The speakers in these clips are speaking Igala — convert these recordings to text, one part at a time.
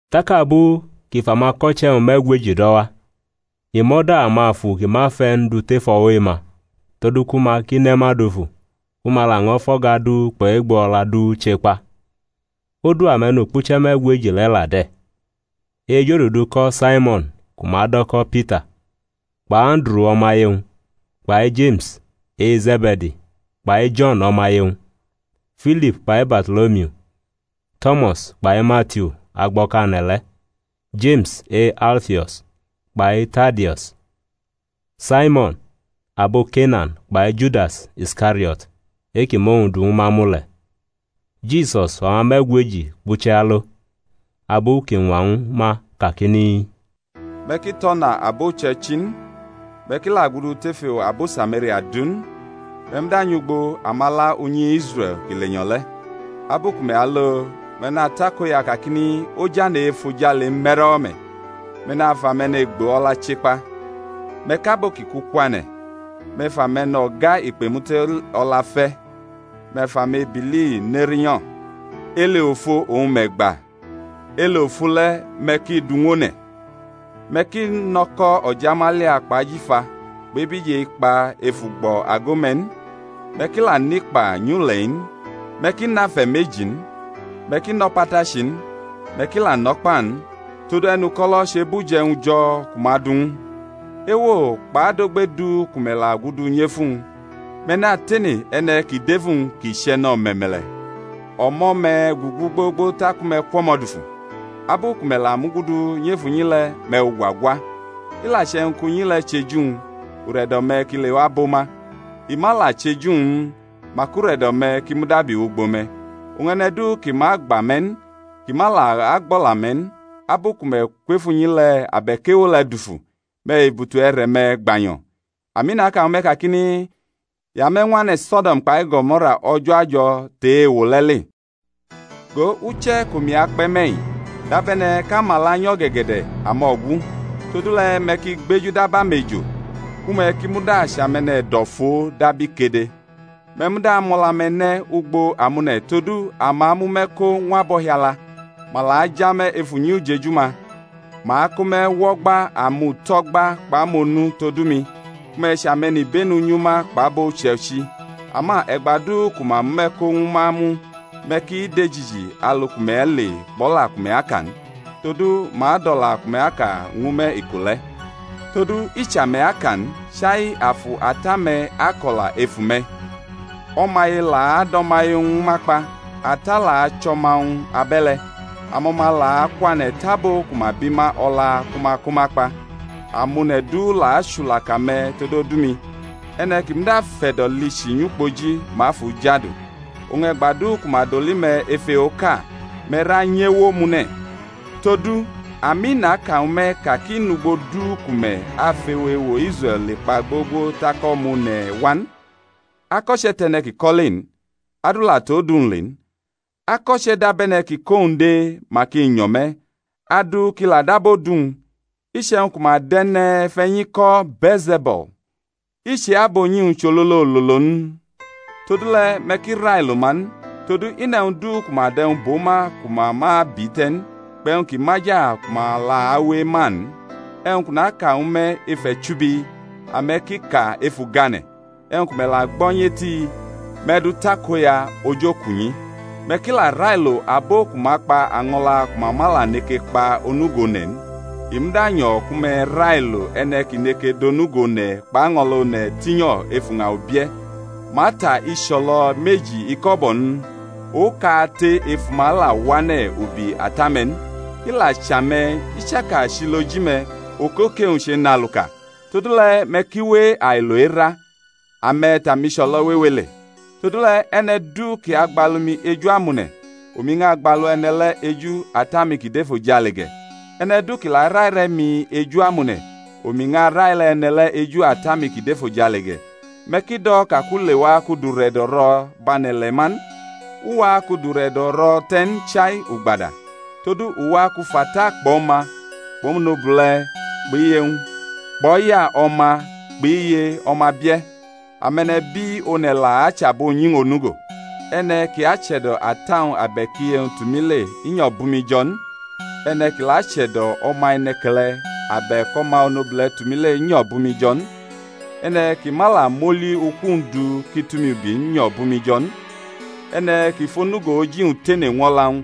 Tak abu kʼi fʼamako̩che̩-wñ me̩gweji do̩ wa, i mʼo̩da amafu ki ma fe̩ n du tef o̩wo̩ e-ma, todu ku ma ki ne ma dufu, ku ma laño̩ fʼo̩ga du kpʼe̩gbo o̩la du chekpa. Odu ame̩nukpuche̩ me̩gweji le̩ la de̩: e-ejodudu ko̩ Saimo̩n ku ma do̩ ko̩ Pita, kpʼAnduru o̩maye-wñ; kpai Jeme̩s e-Ze̩be̩di kpai Jo̩n o̩maye-wñ; Filip kpai Barto̩lomiu; To̩mas kpai Matiu agbo̩kane̩ le̩; Jeme̩s e-Alfio̩s kpai Tadeus; Saimo̩n abo Kenan kpai Judas Iskario̩t, e-kʼi mʼowñ du ñwu ma mu le̩. Jisus fʼama me̩gweji kpʼuche̩ alo, abu kʼi ñwa ñwu ma kakini, Me̩ ki tʼo̩na abo uche̩ichi n, me̩ ki la gudu tef ewo abo Samaria du n. Me̩ muda nyʼugbo amala unyi Israe̩l ki lenyo̩ le̩. Abu ku me̩ alo me̩ natakoya kakini, Ojane̩ e-efojale me̩rʼo̩wo̩ me̩. Me̩ nafʼame̩ne̩gbo o̩la che kpa, me̩ kʼabo ki ku kwane̩, me̩ fʼame̩no̩ga ikpemute o̩la fe̩, me̩ fʼamebili ne rinyo̩; ele ofo oñ me̩ gba, ele ofo le̩ me̩ ki dʼu ñw one̩. Me̩ ki nʼo̩ko̩ o̩jamalia kpʼajifa kpʼebije ikpa ef ugbo̩ ago-me̩ n, me̩ ki la nʼikpa nyʼule̩-i n, me̩ ki nʼafe̩ meji n, me̩ ki nʼo̩patachi n, me̩ ki la nʼo̩kpa n; todu e̩nuko̩lo̩ chebʼuje̩wñ jo̩ ku ma du ñw u. Ewo kpʼadogbe du ku me̩ la gudu nyʼef uwñ, me̩ natene e̩ne̩ kʼi dʼef uwñ kʼi chʼe̩ne̩ o̩me̩me̩le̩; o̩mo̩ me̩ gugu gbogbo taku me̩ kwʼo̩mo̩ dufu. Abu ku me̩ la mugudu nyʼef unyi le̩, me̩ fʼugwa gwa. I la che̩wñ kʼunyi le̩ chʼeju-wñ, ure̩do̩-me̩ ki lewa bʼo ma; i ma la chʼeju-wñ n, mak ure̩do̩-me̩ ki mudabi wʼugbo me̩. Oñ e̩ne̩ du ki ma agba me̩ n, kʼi ma la agbʼo̩la-me̩ n, abu ku me̩ kwʼef unyi le̩ abe̩k ewo le̩ dufu, me̩ fʼebutu e̩re̩-me̩ gbanyo̩. Ami, naka ñwu me̩ kakini, I ame̩ ñw ane̩ So̩do̩m kpai Go̩mo̩ra o̩jo̩ ajo̩ tʼe-ewo le̩ le. Go, uche̩ kʼomi akpe̩ me̩-i dabe̩ne̩ kʼamala nyʼo̩ge̩ge̩de̩ amo̩gu; todule̩ me̩ ki gbeju dab amejo, ku me̩ ki muda chʼame̩ne̩do̩foo dab ikede. Me̩ muda mʼo̩la-me̩ ne̩ ugbo amone̩ todu ama amʼume̩ ko ñw abo o̩hiala, ma la aja me̩ ef unyi ujeju-ma; ma ako me̩ wʼo̩gba amuto̩gba kpʼamonu todu mi, ku me̩ chʼame̩nibenu nyʼuma kpʼabo uche̩ichi. Ama e̩gba du ku ma mʼume̩ ko ñwu ma mu, me̩ ki dejiji alu ku me̩ ale n, kpʼo̩la ku me̩ aka n. Todu ma adʼo̩la ku me̩ aka ñwu me̩ iko le̩; todu i chʼame̩ aka n, chai Afu Ata-me̩ ako̩la ef ume̩. O̩maye la adʼo̩maye ñwu ma kpa; ata la achʼo̩ma-wñ abe̩le̩; amo̩ma la akwane̩ tʼabo ku ma bi ma o̩la ku ma ko ma kpa. Amone̩ du la achulaka me̩ tod odu-mi; e̩ne̩ ki muda fʼe̩do̩ lichi nyʼukpoji, ma afʼu jadu. Oñ e̩gba du ku ma doli me̩ ef ewoʼka, me̩ ra nyʼewo omune̩: todu, ami naka ñwu me̩-i ka kʼi nʼugbo du ku me̩ afʼewo ewo Israe̩l le kpa gbogbo tak O̩ma One̩ wa n. Ako̩che̩ tʼe̩ne̩ kʼi kʼo̩ le n, adu la tʼodu-wñ le n. Ako̩che̩ dab e̩ne̩ kʼi kʼowñ dee, mak i nyo̩ me̩; adu ki la dab odu-wñ. Iche̩wñ ku ma dʼe̩ne̩fe̩nyi ko̩ Bee̩lze̩bul, i chʼe-abunyi-wñ chʼololololo n? Todule̩, me̩ ki railo ma n: todu, i nʼe̩wñ du ku ma dʼe̩wñ bʼo ma ku ma ma abi te̩ n, kpʼe̩wñ kʼi maja ku ma la awe ema n. E̩wñ kʼu naka ñwu me̩ ef e̩chubi, ame̩ ki ka ef ugane̩; e̩wñ ku me̩ la gbo̩ nyʼeti, me̩ dʼu takoya ojokunyi. Me̩ ki la railo abo ku ma kpa año̩la ku ma ma la neke kpa onugo one̩ n, i muda nyo̩ ku me̩ railo e̩ne̩ kʼi neke dʼonugo one̩ kpʼaño̩la one̩ tinyo̩ ef uña ubie̩. Ma ta icho̩lo̩ meji iko̩bo̩ n? Okate ef uma la wʼane̩ ubi Ata-me̩ n. I la chʼame̩, i chaka chʼiloji-me̩, okoke-wñ chenʼaluka. Todule̩ me̩ ki we ailo era: ame̩ tʼamicho̩lo̩ wewe le. Todule̩, e̩ne̩ du kʼi agbalu mi eju amone̩, omi ñʼagbalu e̩ne̩ le̩ eju Ata-mi kʼi dʼefojale ge̩. E̩ne̩ du kʼi la araire̩ mi eju amone̩, omi ñʼaraire̩ e̩ne̩ le̩ eju Ata-mi kʼi dʼefojale ge̩. Me̩ ki do̩ ka kʼu lewa kʼu dʼure̩do̩ ro̩ bʼane̩ ile̩ ma n: u wa kʼu dʼure̩do̩ ro̩ te̩ n, chai ugbada. Todu u wa kʼu fʼata kpʼo̩ma, kpʼo̩monobule̩ kpʼiye-wñ, kpʼo̩ya o̩ma kpʼiye o̩ma bie̩. Ame̩nebi one̩ la achʼabunyi-wñ onugo. E̩ne̩ kʼi ache̩do̩ ata-wñ abe̩k iye-wñ tʼumi le, nyo̩ bʼumi jo̩ n. E̩ne̩ kʼi la ache̩do̩ o̩ma e̩ne̩ke̩le̩ abe̩k o̩ma onobule̩ tʼumi le nyo̩ bʼumi jo̩ n. E̩ne̩ kʼi ma la mʼoli-uku-wñ du kʼi tʼumi ubi n, nyo̩ bʼumi jo̩ n. E̩ne̩ kʼi fʼonugo oji-wñ tene ñw o̩la-wñ,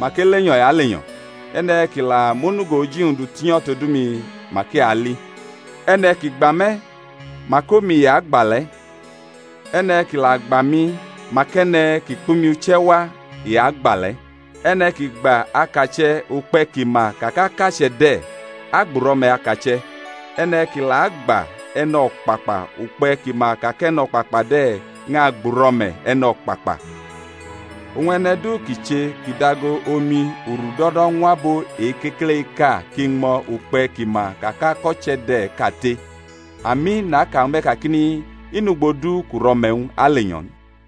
mak elenyo̩ i alenyo̩. E̩ne̩ kʼi la mʼonugo oji-wñ du tinyo̩ todu mi, mak i ali. E̩ne̩ kʼi gba me̩, mak omi i agba le̩; e̩ne̩ kʼi la gba mi, mak e̩ne̩ kʼi kpʼumi uche̩ wa i agba le̩. E̩ne̩ kʼi gba akache̩ ukpe̩ kʼi ma ka kʼakache̩ de̩, agbʼuro̩me̩ akache̩; e̩ne̩ kʼi la agba e̩no̩kpakpa ukpe̩ kʼi ma ka kʼe̩no̩kpakpa de̩, ñʼagbʼuro̩me̩ e̩no̩kpakpa. Oñ e̩ne̩ du kʼi che kʼi dʼago omi urudo̩do̩ ñw abo o-kekele-iʼka kʼi ñmo̩ ukpe̩ kʼi ma ka kʼako̩che̩ de̩ kate— Ami, naka ñwu me̩ kakini, I nʼugbo du kʼuro̩me̩-wñ alenyo̩ n.